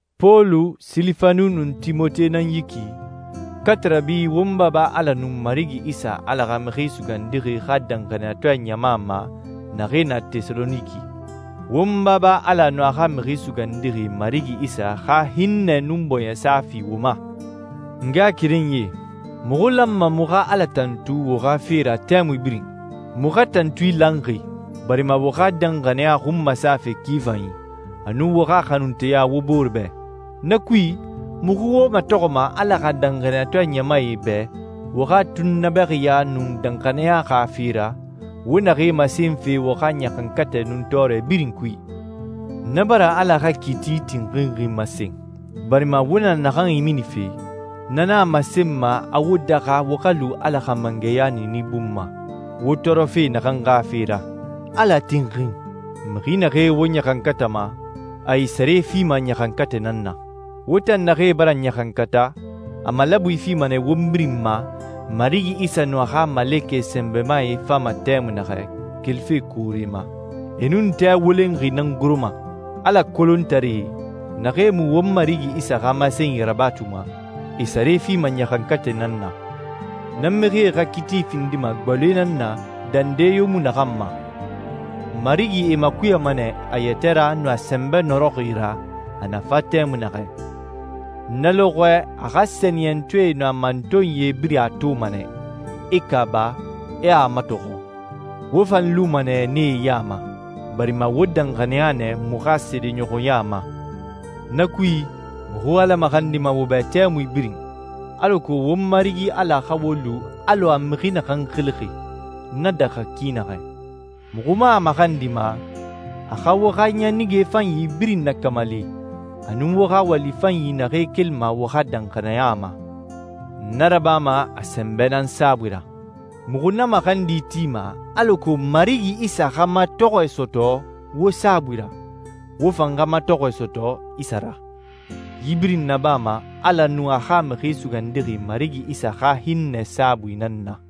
Pɔlu, Silifanu, nun Timote nan yi ki, katarabi won Baba Ala nun Marigi Isa Ala xa Mixi Sugandixi xa danxaniyatɔɛ ɲama ma naxee na Tɛsaloniki. Won Baba Ala nun a xa Mixi Sugandixi Marigi Isa xa hinnɛ nun bɔɲɛsa fi wo ma. N ngaxakerenyie, muxu lanma muxu xa Ala tantu wo xa fe ra tɛmui birin. Muxu xa tantui lanxi barima wo xa danxaniya xun masafe ki fanyi, a nun wo xa xanunteya wo bore bɛ. Na kui, muxu wo matɔxɔma Ala xa danxaniyatɔɛ ɲamae bɛ wo xa tunnabɛxiya nun danxaniya xa fe ra wo naxee masenfe wo xa ɲaxankatɛ nun tɔɔrɛ birin kui. Na bara Ala xa kiiti tinxinxi masen, barima wo na naxan iminife, na nan a masenma a wo daxa wo xa lu Ala xa mangɛya niini bun ma, wo tɔɔrɔfe naxan xa fe ra. Ala tinxin. Mixi naxee wo ɲaxankatama, a e sare fima ɲaxankatɛ nan na. Wo tan naxee bara ɲaxankata, a malabui fima nɛ won birin ma Marigi Isa a nun a xa malekɛ sɛnbɛmae fama tɛmui naxɛ kelife koore ma. E nun tɛ wolenxi nan goroma. Ala kolontaree, naxee mu won Marigi Isa xa masenyi rabatuma, e sare fima ɲaxankatɛ nan na. Na mixie xa kiiti findima gbaloe nan na dande yo mu naxan ma. Marigi e makuyama nɛ a yɛtɛ ra nun a sɛnbɛ nɔrɔxi ra a na fa tɛmui naxɛ. Na lɔxɔɛ a xa sɛniyɛntɔɛe nun a mantonyie birin a toma nɛ, e kaaba, e a matɔxɔ. Wo fan luma nɛ nee ya ma, barima wo danxaniya nɛ muxu xa seedeɲɔxɔya ma. Na kui, muxu Ala maxandima wo bɛ tɛmui birin, alako won Marigi Ala xa wo lu alɔ a mixi naxan xilixi na daxa ki naxɛ. Muxu man a maxandima a xa wo xa ɲanige fanyi birin nakamali a nun wo xa wali fanyi naxee kelima wo xa danxaniya ma. Na rabama a sɛnbɛ nan saabui ra. Muxu na maxandi tima alako Marigi Isa xa matɔxɔɛ sɔtɔ wo saabui ra, wo fan xa matɔxɔɛ sɔtɔ Isa ra. Yi birin nabama Ala nun a xa Mixi Sugandixi Marigi Isa xa hinnɛ saabui nan na.